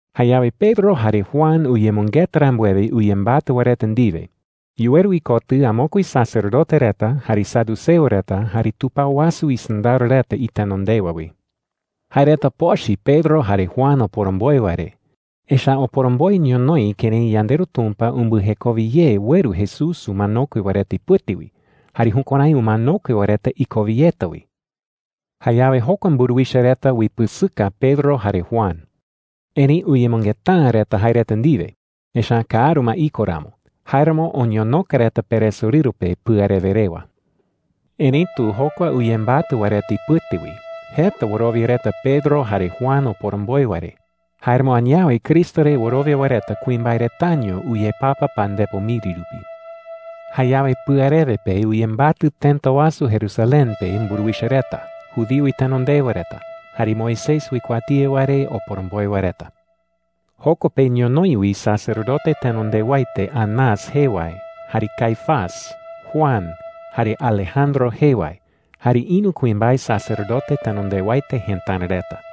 Jayawe Pedro jare Juan uyemɨngeta rambuewe uyembatɨ wae reta ndiwe, yuweru ikotɨ amokue sacerdote reta, jare saduceo reta, jare tupao wasu isɨndaro reta itenondewa wi. Jae reta pochɨ Pedro jare Juan oporomboe wae re. Echa’ä oporomboe ñonoï kërái yandeRu Tumpa umbɨjekowe ye ueru Jesús umanokue wae reta ipɨte wi, jare jukuärái umanokue wae reta ikowe yeta wi. Jayawe jokua mburuwicha reta uipɨsɨka Pedro jare Juan. Erëi uyemɨngeta’ä reta jae reta ndiwe, echa’ä kaaru ma iko ramo. Jáeramo oñonoka reta peresorɨru pe pɨarewe rewa. Erëitu jokua uyembatɨ wae reta ipɨte wi, jeta wɨrowia reta Pedro jare Juan oporomboe wae re. Jáeramo añawe Cristo re wɨrowia wae reta kuimbae retaño uyepapa pandepo miri rupi. Jayawe pɨarewe pe uyembatɨ tëta wasu Jerusalén pe mburuwicha reta, judío itenondewa reta, jare Moisés uikuatía wae re oporomboe wae reta. Joko pe ñonoï wi sacerdote tenondewaete Anás jee wae, jare Caifás, Juan, jare Alejandro jee wae, jare ïru kuimbae sacerdote tenondewaete jëtara reta.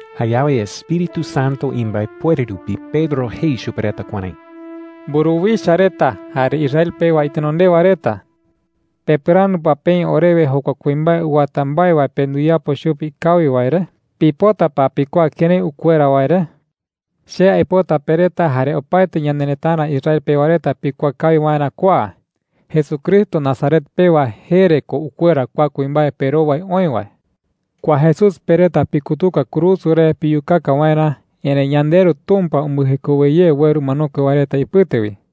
Jayawe Espíritu Santo imbaepuere rupi, Pedro jei chupe reta kuärái: “Mburuwicha reta jare Israel pewa itenondewa reta,” jei. “¿Pepɨrandu pa peï orewe jokua kuimbae uwata mbae wae pe nduyapo chupe ikawi wae re? ¿Pipota pa pikuaa kërái ukuera wae re?” jei. “Che aipota pe reta jare opaete ñanerëtara Israel pewa reta pikuaa kawi waerä kua: Jesucristo Nazaret pewa jee re ko ukuera kua kuimbae perowai oï wae,” jei. “Kua Jesús pe reta pikutuka kurusu re piyukaka waerä, erëi yandeRu Tumpa umbɨjekowe ye ueru umanokue wae reta ipɨte wi,” jei.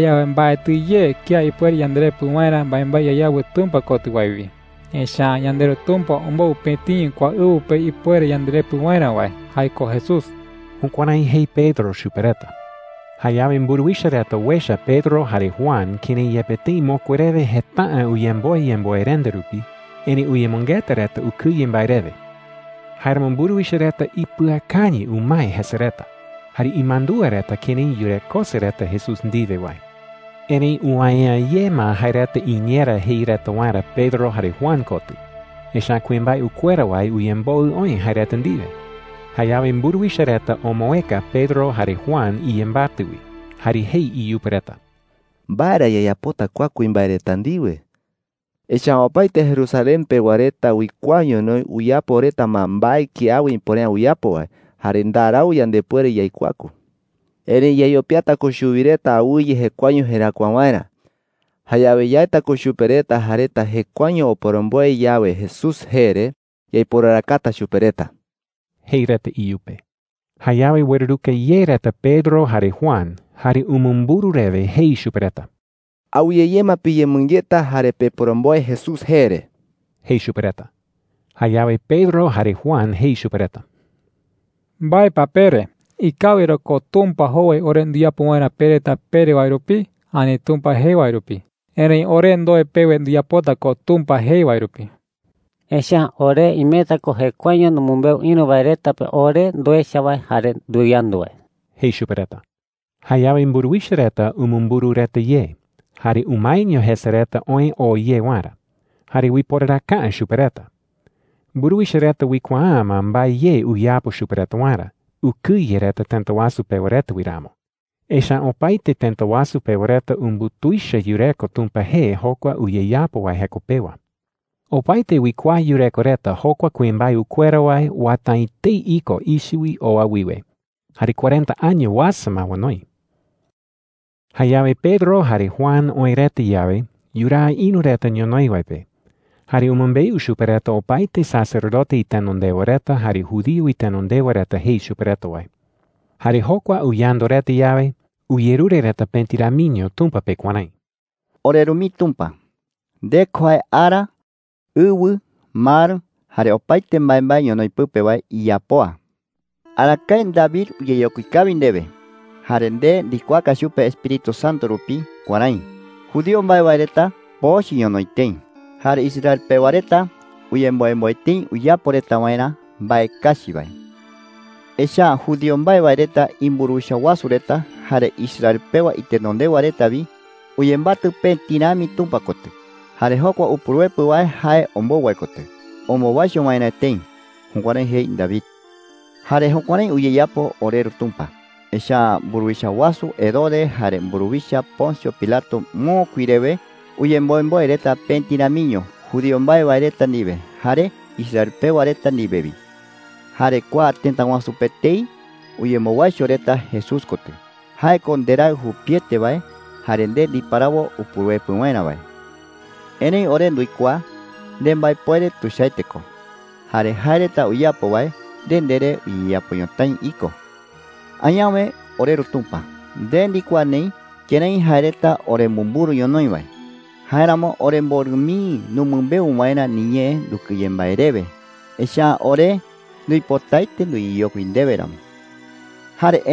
“Jayawe mbaetɨ ye kía ipuere yanderepɨ waerä mbaembae yayawɨ Tumpa kotɨ wae wi. Echa’ä yandeRu Tumpa ombou pëtiño kua ɨwɨ pe ipuere yanderepɨ waerä wae – jae ko Jesús.” Jukuärái jei Pedro chupe reta. Jayawe mburuwicha reta uecha Pedro jare Juan kërái yepe tëi mokui rewe jeta’ä uyemboe yemboerenda rupi, erëi uyemɨngeta reta ukɨye mbae rewe. Jáeramo mburuwicha reta ipɨakañɨ umae jese reta, jare imandúa reta kërái yurekose reta Jesús ndiwe wae. Erëi uwäe’ä ye ma jae reta iñeerä jei reta waerä Pedro jare Juan kotɨ, echa’ä kuimbae ukuera wae uyemboɨ oï jae reta ndiwe. Jayawe mburuwicha reta omoëka Pedro jare Juan iyembatɨ wi, jare jei iyupe reta: “¿Mbae ra yayapota kua kuimbae reta ndiwe?” jei reta. “Echa’ä opaete Jerusalén pewa reta uikuaa ñonoï uyapo reta ma mbae kiawe ipuere’ä uyapo wae. Jare ndarau yandepuere yaikuaku. Erëi yayopiata ko chuwi reta awɨye jekuaeño jeräkua waerä. Jayawe yaeta ko chupe reta jae reta jekuaeño oporomboe yawe Jesús jee re, yaiporarakata chupe reta,” jei reta iyupe. Jayawe ueruruka ye reta Pedro jare Juan, jare umumburu rewe jei chupe reta: “Awɨye ye ma piyemɨngeta jare peporomboe Jesús jee re,” jei chupe reta. Jayawe Pedro jare Juan jei chupe reta: “¿Mbae pa pere? ¿Ikawi ra ko Tumpa jowai ore nduyapo waerä pe reta pere wae rupi ani Tumpa jei wae rupi? Erëi ore ndoe pewe nduyapota ko Tumpa jei wae rupi,” jei reta. “Echa’ä ore imeta ko jekuaeño numɨmbeu ïru wae reta pe ore nduecha wae jare nduyandu wae,” jei chupe reta. Jayawe mburuwicha reta umumburu reta ye, jare umaeño jese reta oë oo ye waerä. Jare uiporaraka’ä chupe reta. Mburuwicha reta uikuaa’ä ma mbae ye uyapo chupe reta waerä, ukɨye reta tëta wasu pewa reta wi ramo. Echa’ä opaete tëta wasu pewa reta umbutuicha yureko Tumpa jee jokua uyeyapo wae jeko pewa. Opaete uikuaa yureko reta jokua kuimbae ukuera wae uwata’ä etei iko ichɨ wi oa wiwe, jare cuarenta año uasa ma onoi. Jayawe Pedro jare Juan oë reta yawe, yuraa ïru reta ñonoï wae pe. Jare umɨmbeu chupe reta opaete sacerdote itenondewa reta jare judío itenondewa reta jei chupe reta wae. Jare jokua uyandu reta yawe, uyerure reta pëti ramiño Tumpa pe kuärái: “OreRu mii Tumpa, nde ko jae ara, ɨwɨ, mar, jare opaete mbaembae ñonoï pɨpe wae iyapoa,” jei reta. “Arakae David uyeyokui kawi ndewe, jare nde ndikuaaka chupe Espíritu Santo rupi kuärái: ‘Judío mbae wae reta pochɨ ñonoï tëi. Jare Israel pewa reta uyemboemboe tëi uyapo reta waerä mbae kachi wae. Echa’ä judío mbae wae reta imburuwicha wasu reta jare Israel pewa itenondewa reta wi uyembatɨ pëti rami Tumpa kotɨ jare jokua Upuruepɨ wae jae ombou wae kotɨ ombowaicho waerä tëi.’ Jukuärái jei David,” jei reta. “Jare jukuärái uyeyapo, oreRu Tumpa. Echa’ä mburuwicha wasu Herodes jare mburuwicha Poncio Pilato mokui rewe uyemboemboe reta pëti ramiño judío mbae wae reta ndiwe jare Israel pewa reta ndiwe wi. Jare kua tëta wasu pe etei uyembowaicho reta Jesús kotɨ – jae ko ndeRaɨ jupiete wae jare nde ndiparawo Upuruepɨ waerä wae,” jei reta. “Erëi ore nduikuaa nembaepuere tuichaete ko. Jare jae reta uyapo wae, nde ndere uyeyapo ñotái iko,” jei reta Tumpa pe. “Añawe, oreRu Tumpa, nde ndikuaa neï kërái jae reta oremumburu ñonoï wae. Jáeramo, oremborɨ mii numɨmbeu waerä niñee ndukɨye mbae rewe, echa’ä ore nduipotaete nduyeyokui ndewe ramo,” jei reta.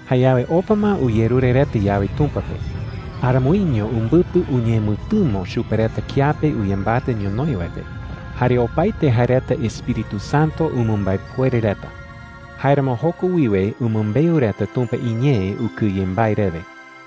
Jayawe, opa ma uyerure reta yawe Tumpa pe, aramoiño umbɨpɨ uñemɨtɨmo chupe reta kiape uyembatɨ ñonoï wae pe. Jare opaete jae reta Espíritu Santo umɨmbaepuere reta. Jáeramo joko wiwe umɨmbeu reta Tumpa iñee ukɨye mbae rewe.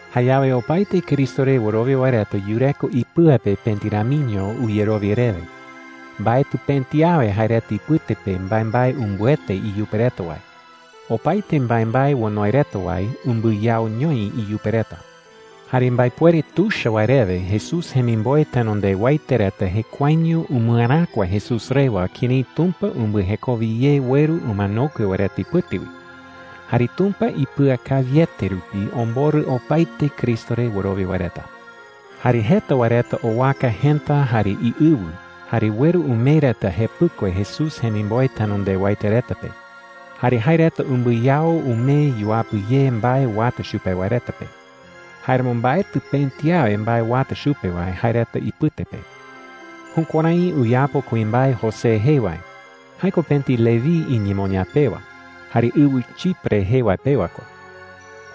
Jayawe opaete Cristo re wɨrowia wae reta yureko ipɨa pe pëti ramiño uyerowia rewe. Mbaetɨ pëti awe jae reta ipɨte pe mbaembae umbɨete iyupe reta wae. Opaete mbaembae onoi reta wae umbɨyaoñoi iyupe reta. Jare mbaepuere tuicha wae rewe Jesús jemimboe tenondewaete reta jekuaeño umɨeräkua Jesús rewa kërái Tumpa umbɨjekowe ye ueru umanokue wae reta ipɨte wi. Jare Tumpa ipɨakawiete rupi omborɨ opaete Cristo re wɨrowia wae reta. Jare jeta wae reta owaka jëta jare iɨwɨ, jare ueru umee reta jepɨkue Jesús jemimboe tenondewaete reta pe. Jare jae reta umbɨyao umee yuapɨ ye mbae uata chupe wae reta pe. Jáeramo mbaetɨ pëti awe mbae uata chupe wae jae reta ipɨte pe. Jukuärái uyapo kuimbae José jee wae. Jae ko pëti Leví iñemoñaa pewa, jare ɨwɨ Chipre jee wae pewa ko.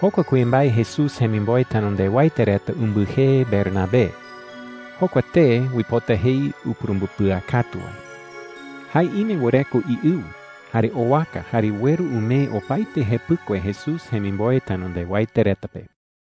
Jokua kuimbae Jesús jemimboe tenondewaete reta umbɨjee Bernabé. Jokua tee uipota jei Upurumbɨpɨakatu wae. Jae ime wɨreko iɨwɨ, jare owaka jare ueru umee opaete jepɨkue Jesús jemimboe tenondewaete reta pe.